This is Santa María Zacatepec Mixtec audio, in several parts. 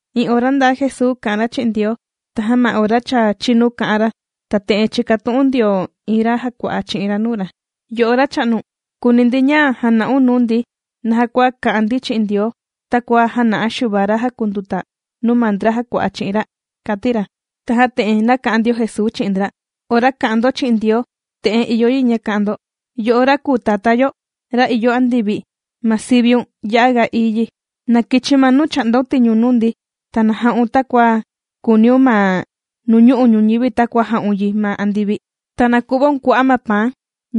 Iin ora ndaa Jesuu kà'an ra chi'in Ndioo, tajan ma ora cha chīnu kā'an ra, ta te'en chīkatu'un ndio iin ra jàkua'a chi'in ra nuu ra: ―Yo'o Racha'nu, kùuni ndi ña jana'un nuu ndi naja kua ka'an ndi chi'in Ndioo takua jāna'a Xuva ra jàkunduta nuu ma ndra jàkua'a chi'in ra ―kàti ra. Tajan te'en nāka'an ndio Jesuu chi'in ndra: ―Ora kà'an ndo chi'in Ndioo, te'en ìyo yi ña ka'an ndo: Yo'o ra kùu Tatá ndi, ra ìyo andivi, ma siviun ya'a ga ií yi. Na kichi ma nuu chà'ndaun tiñu nuu ndi. Ta na ja'un takua kùuniun ma nuñu'u' ñuñivi takua jà'un yi ma andivi. Ta na ku'vaun kua'a' ma paan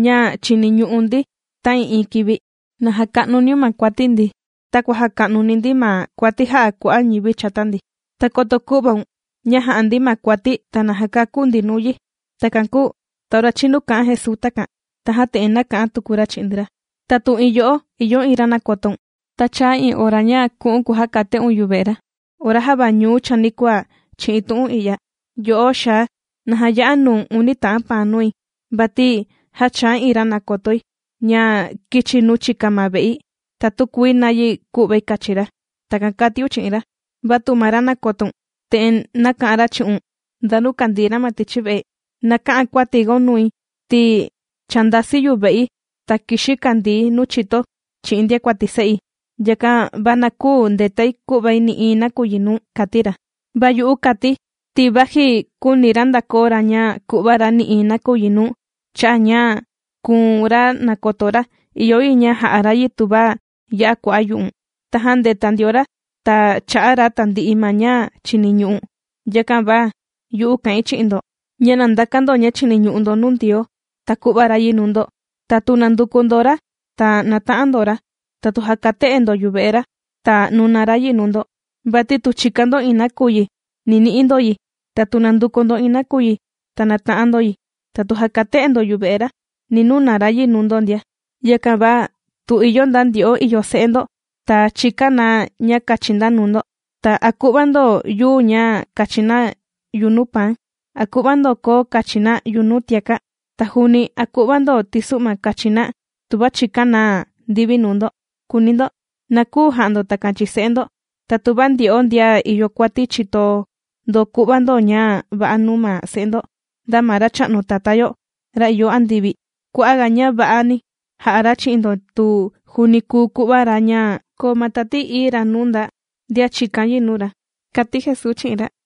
ña chiniñu'u ndi ta'ii'iin kivi. Na jaka'nuniun ma kuati ndi, takua jàka'nuni ndi ma kuati jà'a kua'a' ñivi chata ndi. Ta koto kü'vagaun ña titunini ndi ja'a ndi ma kuati ta na jakaku̱n ndi nuu yi. Takan kūu ta ora chinu kā'an Jesuu takan, tajan te'en nāka'an tuku ra chi'in ndra: ―Ta tu iin yo'o ìyo iin ra nàkotoun, ta chāa iin ora ña ku'u̱n kujakate'un yuve'e ra ora java ñuu chanikuaa chi'in tu'un i'ya: “Yo'o xaa, na jaya'a nuu̱n uni ta'an paan nui, vati já chāa iin ra nàkotoi, ña kīchi nuu chika ma ve'i, ta tükuii nayi ku'vai kachi ra.” Takan kàtiun chi'in ra. Va tu ma ra nàkotoun te'en nàka'an ra chi'un nda nuu kàndii ra ma tichi ve'e: “Na kä'an kuatigaun nui ti cha ndāsi yuve'i ta kìxi̱ kàndii̱ nuu chito chi'in ndiakuati se'i. Yakan va na küu ndetai ku'vai nï'iin nakuyi nuu̱n”, kàti ra. Va yu'u kàti̱, ti vaji küuni ra ndakoo ra ña ku'va ra nï'iin nakuyi nuu̱n cha'a' ña kùu̱n ma ra nàkoto ra, ìyo yi ña ja'a ra yi tuva ya'a kua'a' yu'u̱n. Tajan ndēta ndio ra ta chā'a ra tandi'i ma ña chìniñu'u̱n. Yakan va yu'u kà'in chi'in ndo: ña na ndakan ndo ña chìniñu'u ndo nuu Ndioo, ta ku'va ra yi nuu ndo. Ta tu nànduku ndo ra, ta nàta'an ndo ra. Ta tu jàkate'e ndo yuve'e ra, ta nuna ra yi nuu ndo. Vati tu chìkan ndo iin nakuyi, ni ni'i ndo yi, ta tu nànduku ndo iin nakuyi, ta nàta'an ndo yi, ta tu jàkate'e ndo yuve'e ra, ni nuna ra yi nuu ndo ndia. ’Yakan va tu ìyo nda ndyo'o ìyo se'e ndo, ta chìkan na ña kachi na nuu ndo, ta, ¿a ku'va ndo yuu ña kachi na yunuu paan? ¿A ku'va ndo koo kachi na yunuu tiaka'? Ta juuni, ¿a ku'va ndo tisu'ma kachi na tuva chìkan na ndivi nuu ndo?, kùuni ndo. ¡Na küu ja'a ndo takan chi'in se'e ndo! Ta tuva ndyo'o ndian ìyo kuati chìto ndo ku'va ndo ña va'a nuu ma se'e ndo, nda ma Racha'nu Tatá yo, ra ìyo andivi kua'a' ga ña va'ani ja'a ra chi'in ndo, ta juuni kùu ku'va ra ña koo ma Tati Ií Ra nuu nda ndian chìkan yi nuu ra ―kàti Jesuu chi'in ra.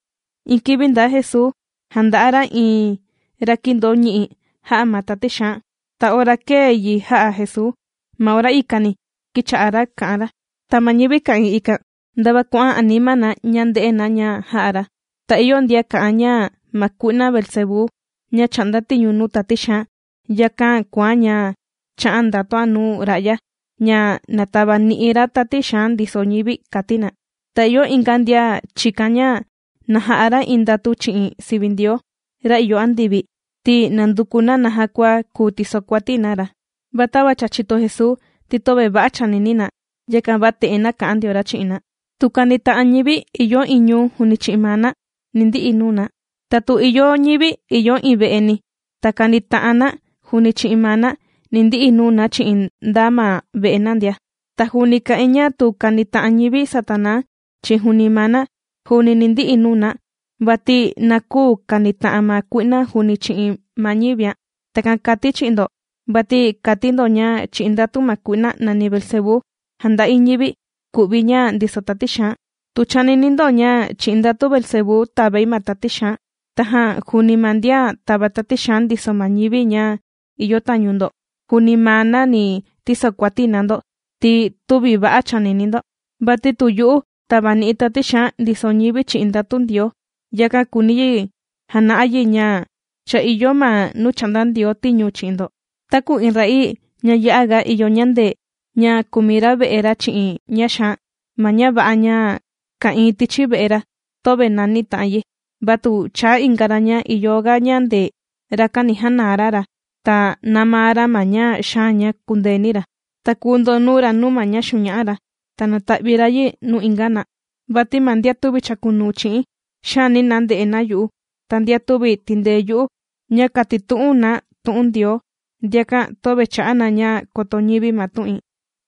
Iin kivi ndaa Jesuu jànda'a ra iin ra kīndoo ñi'i jā'a ma tati xaan. Ta ora kēe yi jā'a Jesuu, ma ora ikani kīcha'a ra kà'an ra. Ta ma ñivi ka'ìin ikan ndava kuà'an anima na ña ndē'e na ña jā'a ra. Ta ìyo ndian kà'an ña ma kui'na Beelzebú ña chà'nda tiñu nuu tati xaan, yakán' kùán' ña chà'án' ndatuán' nuu ra'ya ña na tavani'i ra tati xaan ndiso ñivi, kàti na. Ta ìyo inga ndian chìkan ña na ja'a ra iin ndatu chi'in sivi Ndioo, ra ìyo andivi, ti nànduku na naja kua kùu tisokuati na ra. Va tava cha chìto Jesuu ti töve va'a chànini na, yakan va te'en nāka'an ndio ra chi'in na: ―Tu kànita'an ñivi ìyo iin ñuu juuni chi'in maa na, ni ndi'i nuu na. Ta tu ìyo ñivi ìyo iin ve'eni ta kanita'an na juuni chi'in maa na, ni ndi'i nuu na chi'in nda ma ve'e na ndia. Ta juuni kà'in ña tu kànita'an ñivi Satanaa chi'in juuni maa na, juuni ni ndi'i nuu na, vati na küu kanita'an ma kui'na juuni chi'in ma ñivián'. Takan kàti̱ chi'in ndo vati kàti ndo ña chi'in ndatu ma kui'na nàni Beelzebú jànda'i ñivi ku'vi ña ndiso tati xaan. Tu chànini ndo, ña chi'in ndatu Beelzebú tàvai ma tati xaan. Tajan juuni ma ndian tàva tati xaan ndiso ma ñivi ña ìyo tañu ndo, juuni maa na ni tisokuati na ndo ti tüvi va'a chànini ndo. Vati tu yu'u tàvani'i̱ tati xaan ndiso ñivi chi'in ndatu Ndioo, yakan kùuni yi jana'a yi ña cha ìyo ma nuu chà'nda Ndioo tiñu chi'in ndo. ’Taku iin ra'ii ña ya'a ga ìyo ñandee, ña kùmi ra ve'e ra chi'in ña xaan, ma ña va'a ña ka'ìin tichi ve'e ra töve nani ta'an yi. Va tu chaa inga ra ña ìyo ga ñandee, rakan ni janaa ra ra ta nāmaa ra ma ña xaan ña kùndeeni ra, ta kùu ndonuu ra nuu ma ña xuña'a ra, ta nata'vi ra yi nuu inga na. Vati ma ndian tüvi chàkunuu chi'i̱n, xaani na nde'e na yu'u, ta ndian tüvi tìndee yu'u ña kàtitu'un na tu'un Ndioo, ndiakan töve chà'a na ña koto ñivi ma tu'in.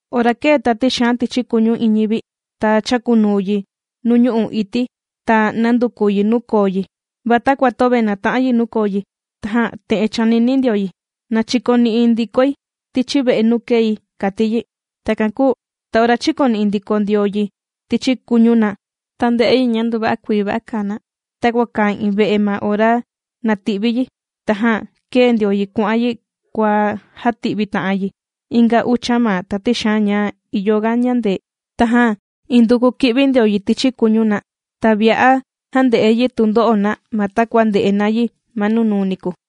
’Ora kèe tati xaan tichi kuñu iin ñivi, ta chàkunuu yi nuu ñu'u' ití ña nànduku yi nuu koo yi. Va takua töve nàta'an yi nuu koo yi tajan te'en chànini ndio yi: “Na chikoni'i ndikoi tichi ve'e nuu kēi”, kàti yi. Takan kūu ta ora chīkoni'i ndiko ndio yi tichi kuñu na, ta ndē'e yi ña nduva'a kuii va'a kàa na takua kàa iin ve'e ma ora nàti'vi yi. Tajan kèe ndio yi kuà'an yi kuàjati'vi ta'an yi inga ucha ma tati xaan ña ìyoga ñàndee. Tajan induku kì'vi ndio yi tichi kuñu na, ta vi'a jànde'e yi tundo'o na ma takua ndè'e na yi ma nunuu niku.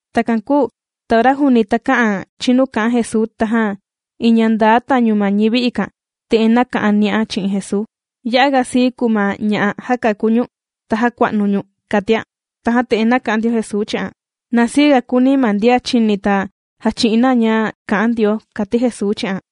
Takan kūu ta ora juuni takä'an chinu kà'an Jesuu, tajan iin ña ndaa tañu ma ñivi ikan te'en nāka'an ni'an chi'in Jesuu: ―¡Ya'a ga sii kùu ma ña'a jākaku ñu̱n, ta jākua'nu ñu̱n! ―kàtian. Tajan te'en nāka'an ndio Jesuu chi'an: ―¡Na siiga kùuni ma ndian chìni ta jàchi'in na ña kà'an Ndioo! ―kàti Jesuu chi'an.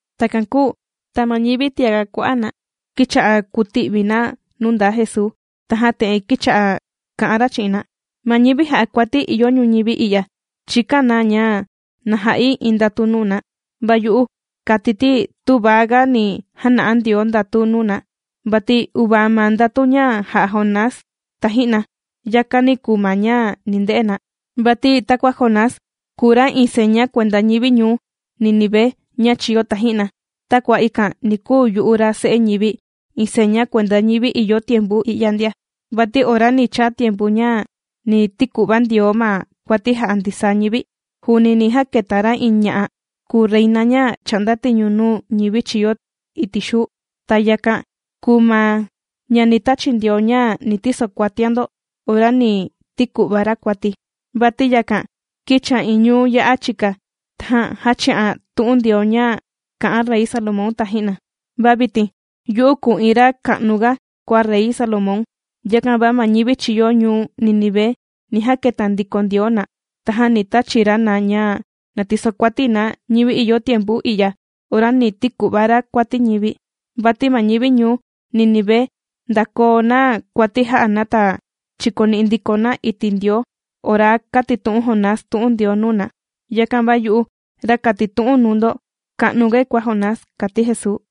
Takan kūu ta ma ñivi tiaga kua'a' na kīcha'a kùti'vi na nuu ndaa Jesuu, tajan te'en kīcha'a kà'an ra chi'in na: ―Ma ñivi jà'a kuati ìyo ñuñivi i'ya chìkan na ña na ja'i iin ndatu nuu na. Va yu'u kàti̱ ti tüva ga ni jana'a Ndioo ndatu nuu na, vati uvaa ma ndatu ña jā'a Jonás taji'na. Yakani kùu ma ña ni nde'e na. Vati takua Jonás, kūu ra iin seña kuenda ñivi ñuu Nínive ña chīyo taji'na, takua ikan ni kuu yu'u ra Se'e ñivi iin seña kuenda ñivi ìyo tiempu i'ya ndia. Vati ora ni chaa tiempu ña ni tiku'va Ndioo ma kuati jà'a ndisaa ñivi, juuni ni jaketa ra iin ña'a kūu reina ña chà'nda tiñu nuu ñivi chīyo iti' xuu. Ta yakan kùu ma ña ni tachi Ndioo ña na tisokuatian ndo ora ni tiku'va ra kuati. Vati yakan kīchian iin ñuu ya'a chika, tajan jāchi'an tu'un Ndioo ña kā'an Rey Salomón taji'na. Va vitin yu'u kùu iin ra ka'nu ga kua Rey Salomón. Yakan va ma ñivi chīyo ñuu Nínive ni jaketa ndiko Ndioo na, tajan ni tachi ra na ña na tisokuati na ñivi ìyo tiempu i'ya ora ni tiku'va ra kuati ñivi. Vati ma ñivi ñuu Nínive ndākoo na kuati jā'a na ta chīkoni'i ndiko na iti' Ndioo ora kātitu'un Jonás tu'un Ndioo nuu na. Yakan va yu'u ra kàtitu'un nuu ndo ka'nugai kua Jonás ―kàti Jesuu.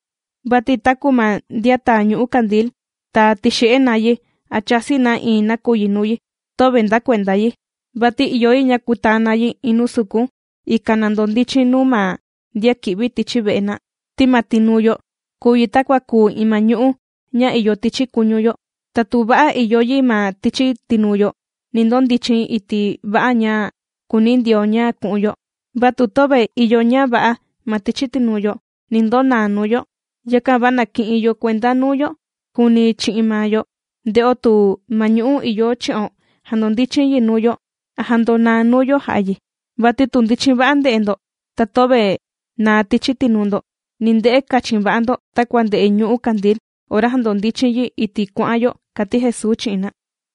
’Vati taku ma ndian tàa ñu'ú kandil ta tìxe'e na yi a chàsi na iin nakuyi nuu yi, töve nda kuenda yi, vati ìyo yi ña kutaa na yi iin nuu sukun, ikan na ndondichin nuu ma ndian kì'vi tichi ve'e na. Ti ma tinuu yo kùu yi takua kùu iin ma ñu'ú ña ìyo tichi kuñu yo. Ta tu va'a ìyo yi ma tichi tinuu yo, ni ndondichin iti' va'a ña kùuni Ndioo ña ku'un yo, vatu töve ìyo ña va'a ma tichi tinuu yo ni ndonaa nuu yo. Yakan va na ki'in yo kuenda nuu yo juuni chi'in maa yo, nde'o tu ma ñu'ú ìyo chi'o jàndondichin yi nuu yo a ndonaa nuu yo jà'a yi. Vati tu ndichin va'a nde'e ndo ta töve naa tichi tinuu ndo, ni nde'e kachin va'a ndo takua nde'e ñu'ú kandil ora jandondichin yi iti' kuà'an yo ―kàti Jesuu chi'in na.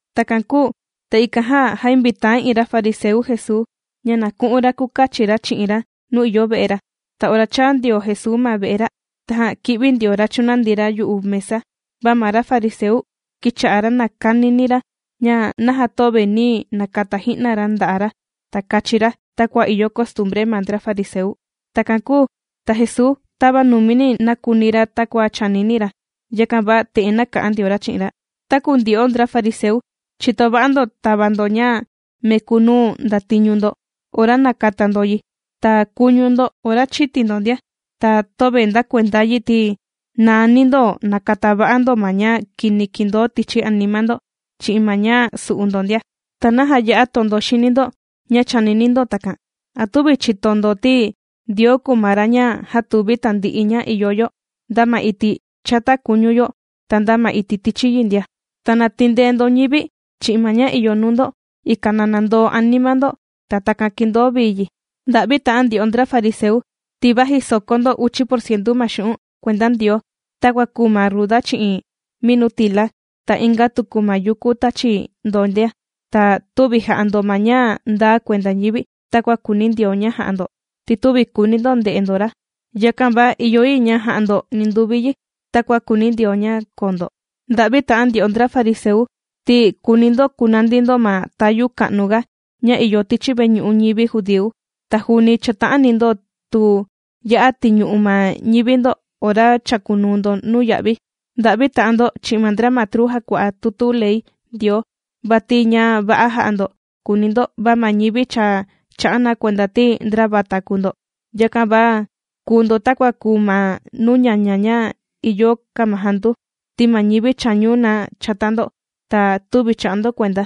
Takan kūu ta ikan jan jāinvitaa iin ra fariseu Jesuu ña na ku'un ra kukachi ra chi'in ra nuu ìyo ve'e ra. Ta ora chāa ndio Jesuu ma ve'e ra, tajan kī'vi ndio ra, ta chūnandi ra yu'u mesa. Va ma ra fariseu kīcha'a ra nàkanini ra ña naja töve nī nakata ji'na ra nda'a' ra, ta kachi ra takua ìyo costumbre ma ndra fariseu. Takan kūu ta Jesuu tava numi nākuni ra takua chànini ra, yakan va te'en nāka'an ndio ra chi'in ra: ―Taku ndyo'o ndra fariseu, chìto va'a ndo tava ndo ña meku nuu ndatiñu ndo ora nàkata ndo yi, ta kuñu ndo ora chìti ndo ndia, va töve ndakuenda yi ti nàani ndo nàkata va'a ndo ma ña kini kìndoo tichi anima ndo chi'in ma ña su'u ndo ndia. ¿Ta naja ya'a tondo xini ndo ña chànini ndo takan? ¿A tüvi chìto ndo ti Ndioo kùu ma ra ña jātuvi tandi'i ña ìyo yo, nda ma iti' chata kuñu yo ta nda ma iti' tichi yi ndia? Ta na tindee ndo ñivi chi'in ma ña ìyo nuu ndo, ikan na nandoo anima ndo ta takan kindoo vii yi. ’¡Nda'vi ta'an ndyo'o ndra fariseu, ti vaji sòkó ndo uchi porcientu ma xu'un' kuenda Ndioo, takua kùu ma ruda chi'in minutila ta inga tuku ma yuku tàchi ndo ndia, ta tüvi jà'a ndo ma ña ndaa kuenda ñivi takua kùuni Ndioo ña jà'a ndo, ti tüvi kùuni ndo nde'e ndo ra! Yakan va ìyo yi ña ja'a ndo ninduvi yi takua kùuni Ndioo ña koo ndo. ’¡Nda'vi ta'an ndyo'o ndra fariseu! Ti kùuni ndo kunandi ndo ma tayu ka'nu ga ña ìyo tichi veñu'u ñivi judíu, ta juuni chàta'ani ndo tu ya'a tìñu'u ma ñivi ndo ora chàkunuu ndo nuya'vi. ’¡Nda'vi ta'an ndo chi'in ma ndra matru jàkua'a tutu ley Ndioo! ¡Vati ña va'a jà'a ndo kùuni ndo, va ma ñivi cha chà'a na kuenda ti ndra vata kùu ndo! Yakan va kùu ndo takua kùu ma nuu ñaña ña ìyo kamajandu, ti ma ñivi chàñu na chata ndo ta tüvi chà'a ndo kuenda.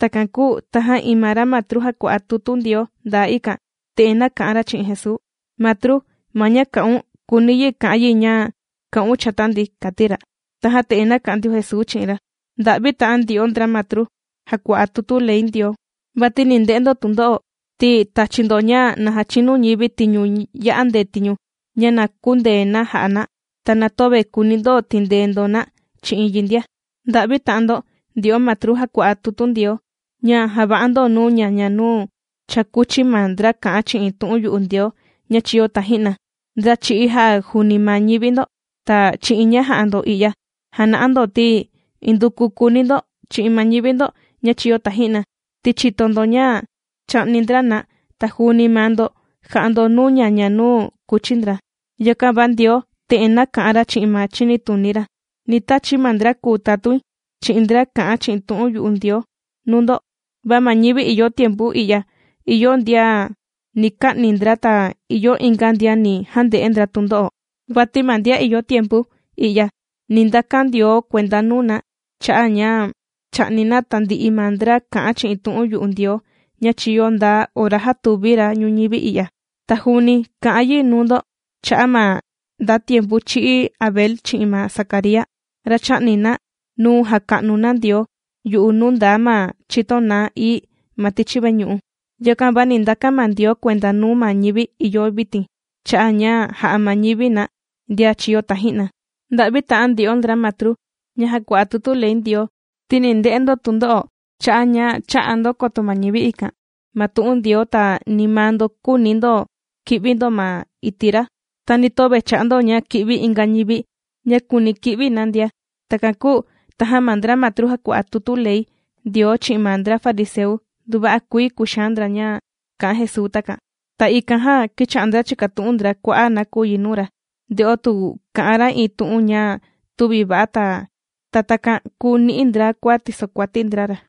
Takan kūu tajan iin ma ra matru jàkua'a tutu Ndioo ndaa ikan te'en nāka'an ra chi'in Jesuu: ―Matru, ma ña kà'un, kùuni yi ka'an yi ña kà'un chata ndi ―kàti ra. Tajan te'en nāka'an ndio Jesuu chi'in ra: ―¡Nda'vi ta'an ndyo'o ndra matru jàkua'a tutu ley Ndioo! Vati ni nde'e ndo tundo'o ti tàchi ndo ña na jachinu ñivi tiñu ya'a ndetiñu ña na kündee na jà'a na. Ta na töve kùuni ndo tindee ndo na chi'in yi ndia. ’¡Nda'vi ta'an ndo ndyo'o matru jàkua'a tutu Ndioo, ña jàva'a ndo nuu ñaña nuu cha kūchi ma ndra kà'an chi'in tu'un yu'u Ndioo ña chīyo taji'na ndra chī'í jā'a juuni ma ñivi ndo! Ta chi'in ña jà'a ndo i'ya jàna'a ndo ti induku kùuni ndo chi'in ma ñivi ndo ña chīyo taji'na, ti chìto ndo ña chā'ni ndra na ta juuni maa ndo jà'a ndo nuu ñaña nuu kùchi ndra. ’Yakan va Ndioo te'en nāka'an ra chi'in ma chinituni ra: “Ni tachi̱ ma ndra kùu tatuin chi'in ndra kà'an chi'in tu'un yu'u Ndioo nuu ndo, va ma ñivi ìyo tiempu i'ya ìyo ndian ni ka'ni ndra ta ìyo inga ndian ni jande'e ndra tundo'o.” Vati ma ndian ìyo tiempu i'ya ni ndakan Ndioo kuenda nuu na cha'a' ña chā'ni na tandi'i ma ndra kà'an chi'in tu'un yu'u Ndioo ña chīyo nda ora jātuvi ra ñuñivi i'ya. Ta juuni kà'an yi nuu ndo cha'a' ma nda tiempu chī'í Abel chi'in ma Zacaría, ra chā'ni na nuu jàka'nu na Ndioo yu'u nuu ndaa ma chito naá ií ma tichi veñu'u. Yakan va ni ndakan ma Ndioo kuenda nuu ma ñivi ìyo vitin cha'a' ña jā'a ma ñivi na, ndian chīyo taji'na. ’Nda'vi ta'an ndyo'o ndra matru ña jàkua'a tutu ley Ndioo, ti ni nde'e ndo tundo'o cha'a' ña chä'a ndo koto ma ñivi ikan ma tu'un Ndioo, ta ni maa ndo küuni ndo ki'vi ndo ma iti' ra, ta ni töve chà'a ndo ña ki'vi inga ñivi ña kùuni ki'vi na ndia. Takan kūu tajan ma ndra matru jàkua'a tutu ley Ndioo chi'in ma ndra fariseu nduva'a kuii kùxaan ndra ña kā'an Jesuu takan. Ta ikan jan kīcha'a ndra chìkatu'un ndra kua'a' nakuyi nuu ra, nde'o tu kà'an ra iin tu'un ña tüvi va'a, ta takan kùu ni'i ndra kua tìsokuati ndra ra.